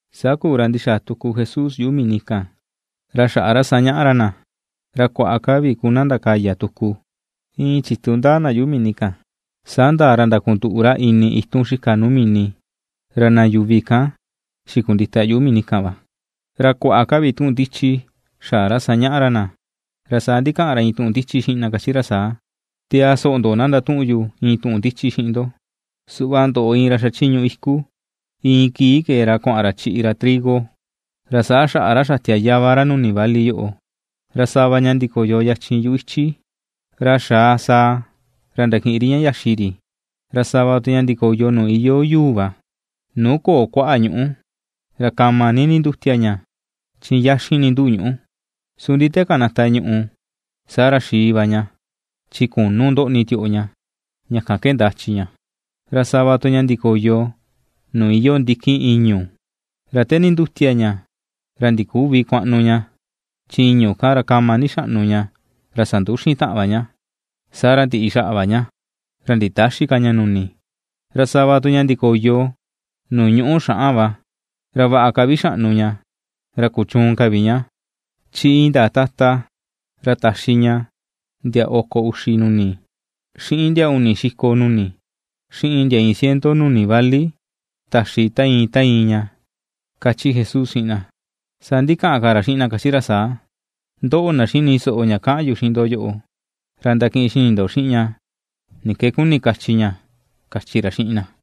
Saa kuu, ra ndixaa tuku Jesús yuꞌu mini kan, ra xaꞌa ra sañaꞌa ra na. Ra kuaꞌa ka vi ku na ndakaya tuku. Iin chitu ndaa na yuꞌu mini kan, saa ndaa ra ndakunduꞌu ra ini itun xika nuu mini, ra na yuvi kan xikundita yuꞌu mini kan va. Ra kuaꞌa ka vi tuꞌun ndichi xaꞌa ra sañaꞌa ra na. Ra saa ndikaꞌan ra iin tuꞌun ndichi xiꞌin na kachi ra saa: ―Tiaa soꞌo ndo; na ndatuꞌun yu iin tuꞌun ndichi xiꞌin ndo. Saa kuu, ra kee iin ra chiꞌi kuaꞌan ra chiꞌi ra itu trigo. Ra saa kuu ra xatia yava ra nuni vali kan kuaꞌan ra, ra sava ña ndikoyo yachin yuꞌu ichi, ra xaa sàà ra ndakiꞌin ri ña xaxi ri. Ra sava tu ña ndikoyo nuu iyoo yuu va, nuu köo kuaꞌa ñuꞌú, ra kama ni nindutia ña, chi yaxin ni ndúꞌu̱ ñuꞌú. Su ndi te kanata ñuꞌù, saa ra xii va ña, chi künu ndoꞌni tioꞌo ña, ña kan ke ndachi̱ ña. Ra sava tu ña ndikoyo nuu iyoo ndikin ìñu̱, ra te nindutia ña, ra ndiküvi kuaꞌnu ña, saa chi ìñu̱ kan va sanduxin ñaꞌa, saa ra ndiꞌi xaꞌa va ña, ra nditäxi ka ña nuni. Ra sava tu ña ndikoyo nuu ñuꞌú xaꞌan va, ra vaꞌa ka vi xaꞌnu ña, ra kuchuun ka vi ña, chi indaa tata ra taxi ña ndia oko uxi nuni, xiꞌin ndia uni xiko nuni, xiꞌin ndia iin ciento nuni vali taxi ta iin, ta iin ña ―kachi Jesús xiꞌin na. Saa ndikaꞌan ka ra xiꞌin na, kachi ra saa: ―Ndoꞌo, na xini soꞌo ña kaꞌan yu xiꞌin ndo yoꞌo, ra ndakiꞌin xini ndo xiꞌin ña ni ke kuni kachi ña ―kachi ra xiꞌin na.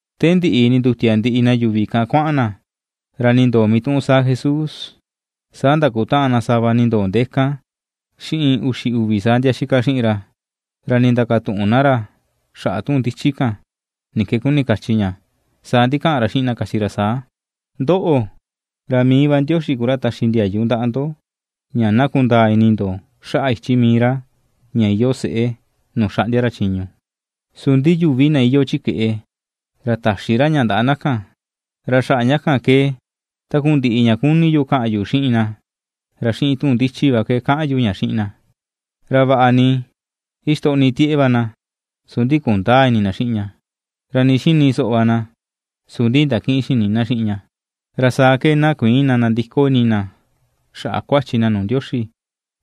Te ndiꞌi nindutia ndiꞌi na yuvi kan kuaꞌan na, ra nindoo mituꞌun saa Jesús, saa ndakutaꞌan sava na nindoo ndee kan, xiꞌin uxi uvi saa ndia itaꞌan xiꞌin ra, ra ndindakatuꞌun na ra xaꞌa tuꞌun ndichi kan, ni ke kuni kachi ña. Saa ndikaꞌan ra xiꞌin na kachi ra saa: ―Ndoꞌo, ra mii Ndioxi va ku ra taxi ndiayu ndaꞌa ndo ña na kundaa ini ndo xaꞌa ichi mii ra ña iyoo seꞌe nuu xaꞌndia ra chiñu. Su ndi yuvi na iyoo chi keꞌe, ra täxi ra ña ndaꞌa na kan, ra xaꞌa ña kan ke takundiꞌi ña kuni yu kaꞌan yu xiꞌin na, ra xiꞌin tuꞌun ndichi va ke kaꞌan yu ña xiꞌin na. Ra vaꞌa ni ixtoꞌni tieꞌe va na, su ndi kundäa ini na xiꞌin ña, ra nii xini soꞌo va na, su ndi ndakïꞌin xini na xiꞌin ña, ra saa ke na kuïin na ndandiko ini na xaꞌa kuachi na nuu Ndioxi,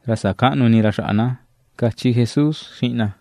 ra sakäꞌnu ini ra xaꞌa na ―kachi Jesús xiꞌin na.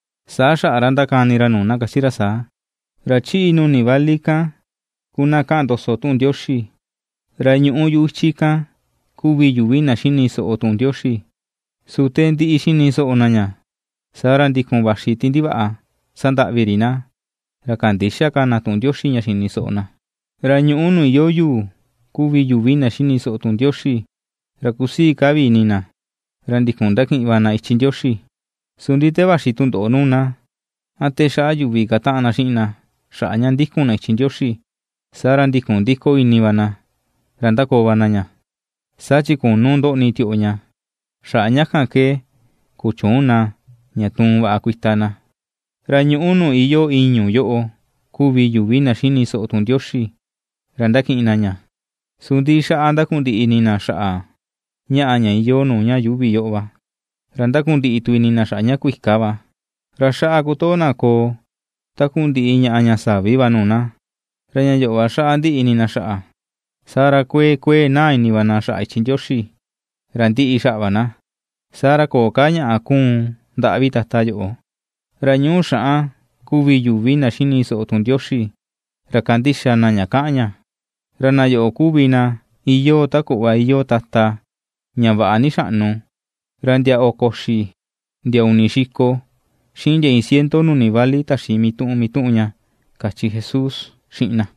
Saa xaꞌa ra ndakani ra nuu na kachi ra saa: ―Ra chiꞌi nuni vali kan ku na kaꞌan ndoso tuꞌun Ndioxi. Ra ñuꞌu yuꞌu ichi kan kuvi yuvi na xini soꞌo tuꞌun Ndioxi. Su te ndiꞌi xini soꞌo na ña, saa ra ndikun vaxi ti ndivaꞌa sandaꞌvi ri na, ra kandïxa ka na tuꞌun Ndioxi ña xini soꞌo na. Ra ñuꞌú nuu iyoo yuu kuvi yuvi na xini soꞌo tuꞌun Ndioxi, ra kusii ka vi ini na, ra ndikun ndakiꞌin va na ichi Ndioxi. Su ndi te vaxi tundoꞌo nuu na, a te xaꞌa yuvi kataꞌan na xiꞌin na xaꞌa ña ndikun na ichi Ndioxi, saa ra ndikun ndiko ini va na, ra ndakoo va na ña, saa chi künu ndoꞌni tioꞌo ña, xaꞌa ña kan ke kuchüun na ña tuun vaꞌa kuita na. Ra ñuꞌú nuu iyoo ìñu̱ yoꞌo kuvi yuvi na xini soꞌo tuꞌun Ndioxi, ra ndakiꞌin na ña. Su ndi xaꞌa ndakundiꞌi ini na xaꞌa ñaꞌa ña iyoo nuu ña yuuvi yoꞌo va, ra ndakundiꞌi tu ini na xaꞌa ña kuika va, ra xaꞌa kutoo na koo takundiꞌi ñaꞌa ña savi va nuu na, ra ña yoꞌo va xaꞌa ndiꞌi ini na xaꞌa. Saa ra kuee kuee naa ini va na xaꞌa ichi Ndioxi, ra ndiꞌi xaꞌa va na, saa ra, köo ka ñaꞌa kuun ndaꞌa vi tata yoꞌo. Ra ñuꞌú xaꞌan kuvi yuvi na xini soꞌo tuꞌun Ndioxi, ra kandixa na ña kaꞌan ña. Ra na yoꞌo kuvi na iyoo ta kuꞌva iyoo tata ña vaꞌa ni xaꞌnu, ra ndia oko uxi, ndia uni xiko, xiꞌin ndia iin ciento nuni vali taxi mituꞌun mituꞌun ña ―kachi Jesús xiꞌin na.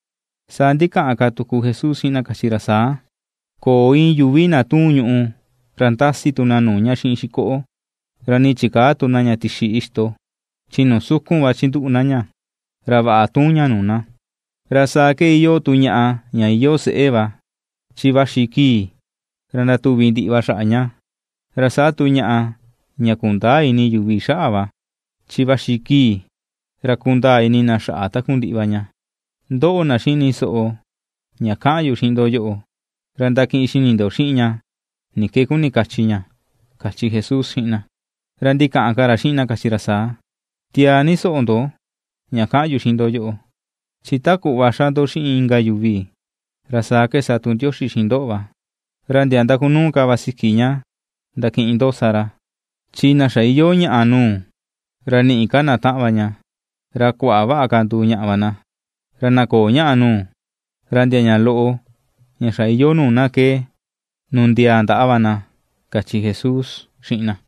Saa ndikaꞌan ka tuku Jesús xiꞌin na kachi ra saa: ―Köo iin yuvi na tuun ñùꞌù, ra ndasi tu na nuu ña xiꞌin xikoꞌo; ra nii chikäa tu na ña tixi ixto, chi nuu sukun va chinduꞌu na ña, ra vaꞌa tuun ña nuu na. Ra saa ke iyoo tu ñaꞌa ña iyoo seꞌe va, chi vaxi kii ra ndatuvi ndiꞌi va xaꞌa ña, ra saa tu ñaꞌa ña kundäa ini yuvi xaꞌa va, chi vaxi kii ra kundaa ini na xaꞌa takundiꞌi va ña. Ndoꞌo, na xini soꞌo ña kaꞌan yu xiꞌin ndo yoꞌo, ra ndakiꞌin xini ndo xiꞌin ña ni ke kuni kachi ña ―kachi Jesús xiꞌin na. Ra ndikaꞌan ka ra xiꞌin na kachi ra saa: ―Tiaa ni soꞌo ndo ña kaꞌan yu xiꞌin ndo yoꞌo. Chi ta kuꞌva xa ndo xiꞌin inka yuvi, ra saa ke sa tu Ndioxi xiꞌin ndoꞌo va, ra ndia ndakunuu ka va siki ña ndakiꞌin ndoꞌo sa ra. Chi na xa iyoo ñaꞌa nuu, ra ni̱ꞌi̱ ka na taꞌan va ña; ra na köo ñaꞌa nuu, ra ndia ña loꞌo ña xa iyoo nuu na ke nundiaa ndaꞌa va na ―kachi Jesús xiꞌin na.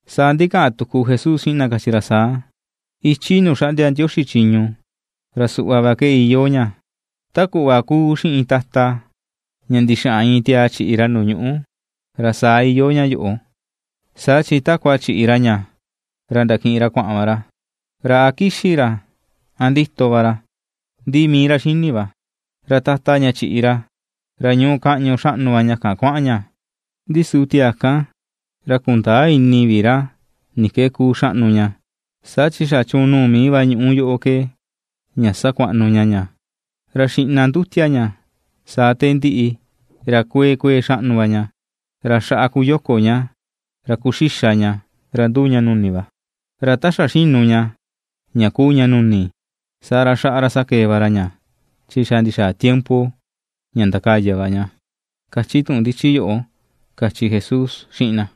Saa ndikaꞌan tuku Jesús xiꞌin na kachi ra saa: ―Ichi nuu xaꞌndia Ndioxi chiñu ra suꞌva va ke iyoo ña: ta kuꞌva kuu xiꞌin tata, ña ndixaꞌan iin tiaa chiꞌi ra nuu ñuꞌú, ra saa iyoo ña yoꞌo. Saa chi takua chiꞌi ra ña ra ndakiꞌin ra kuaꞌan va ra, ra a kixi̱ ra, a ndito va ra, ndi mii ra xini va, ra tata ña chiꞌi ra, ra ñuu kaꞌñu xaꞌnu va ña kan kuaꞌan ña, ndi su tiaa kan, ra kundäa ini vi ra ni ke kuu xaꞌnu ña. Saa chi xa chuun nuu mii va ñuꞌu yoꞌo ke, ña sakuaꞌnu ña ña, ra xiꞌna ndutia ña, saa te ndiꞌi, ra kuee kuee xaꞌnu va ña, ra xaꞌa kuyoko ña, ra kuxixa ña ra nduu ña nuni va. Ra ta xa xinu ña, ña kuu ña nuni, saa ra, xaꞌa ra sakee va ra ña, chi xa ndixaa tiempo ña ndakaya va ña, kachi tuꞌun ndichi yoꞌo ―kachi Jesús xiꞌin na.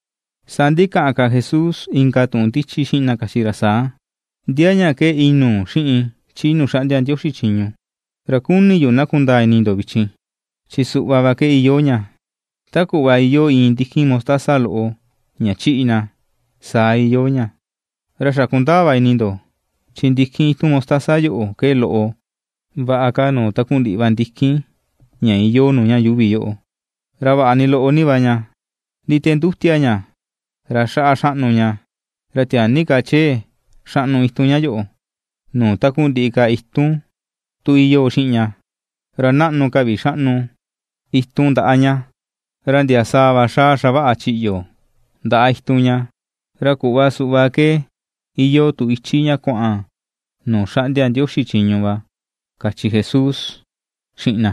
Saa ndikaꞌan ka Jesús inka tuꞌun ndichi xiꞌin na kachi ra saa: ―¿Ndia ña ke inuu xiꞌin chi nuu xaꞌndia Ndioxi chiñu? Ra kuni yu na kundaa ini ndo vichin. Chi suꞌva va ke iyoo ña: ta kuꞌva iyoo iin ndikin mostaza loꞌo ña chiꞌi na, saa iyoo ña. Ra xa kundaa va ini ndo chin ndikin itun mostaza yoꞌo ke loꞌo vaꞌa ka nuu takundiꞌi va ndikin ña iyoo nuu ña yuuvi yoꞌo; ra vaꞌa ni loꞌo ni va ña, ndi te ndutia ña ra xaꞌa xaꞌnu ña, ra tiaa ni ka chee xaꞌnu itun ña yoꞌo nuu takundiꞌi ka itun tu iyoo xiꞌin ña; ra naꞌnu ka vi xaꞌnu itun ndaꞌa ña, ra ndia sàà va xaa xavaꞌa chiꞌyo ndaꞌa itun ña. Ra kuꞌva suꞌva ke iyoo tu ichi ña kuaꞌan nuu xaꞌndia Ndioxi chiñu va ―kachi Jesús xiꞌin na.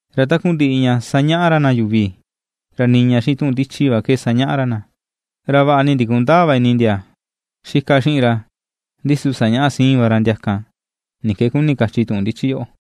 Ra takundiꞌi ña sañaꞌa ra na yuvi, ra niña xiꞌin tuꞌun ndichi va ke sañaꞌa ra na, ra vaꞌa ni ndikundäa va ini ndia itaꞌan xiꞌin ra, ndi su sañaꞌa siin va ra ndia kan ni ke kuni kachi tuꞌun ndichi yoꞌo.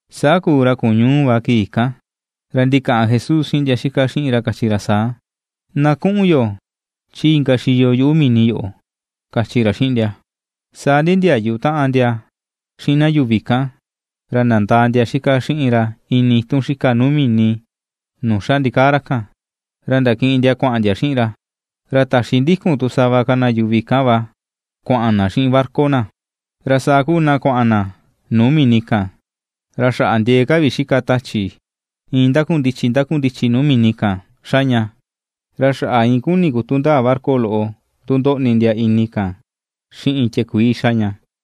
Saa kuu ra kuñuu va kii kan. Ra ndikaꞌan Jesús xiꞌin ndia itaꞌan xiꞌin ra kachi ra saa: ―Na kuꞌun yo chi inka xiyo yuꞌu mini yoꞌo ―kachi ra xiꞌin ndia. Saa nindiayu taꞌan ndia xiꞌin na yuvi kan, ra nandaa ndia itaꞌan xiꞌin ra ini itun xika nuu mini nuu xa ndikaa ra kan, ra ndakiꞌin ndia kuaꞌan ndia xiꞌin ra. Ra taxi ndikun tu sava ka na yuvi kan va kuaꞌan na xiꞌin barca na. Ra saa kuu na kuaꞌan na nuu mini kan, ra xaꞌa ndiee ka vi xika tachi, iin ndakundichi ndakundichi nuu mini kan xa ña, ra xaꞌa iin kuni̱ kutu ndaa barca loꞌo tu ndoꞌni ndia ini kan xiꞌin tiakuii xa ña.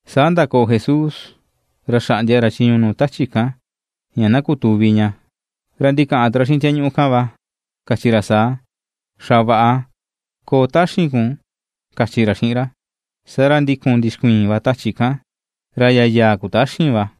Saa ndakoo Jesús, ra xaꞌndia ra chiñu nuu tachi kan, ña na kutuvi ña ra ndikaꞌan tu ra xiꞌin tiañuꞌu kan va kachi ra saa: ―Xavaꞌa, koo taxin kun, ―kachi ra xiꞌin ra. Saa ra ndikun ndixkuiin va tachi kan, ra yayaa kutaxin va.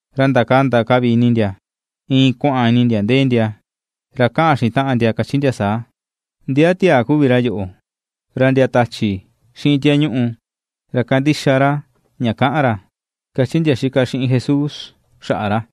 Ra ndakanda ka vi ini ndia, iin kuaꞌan ini ndia ndee ndia, ra kaꞌan xiꞌin taꞌan ndia kachi ndia saa: ―¿Ndia tiaa kuvi ra yoꞌo? Ra ndia tachi xiꞌin tiañuꞌu, ra kandixa ra ña kaꞌan ra ―kachi ndia xika xiꞌin Jesús xaꞌa ra.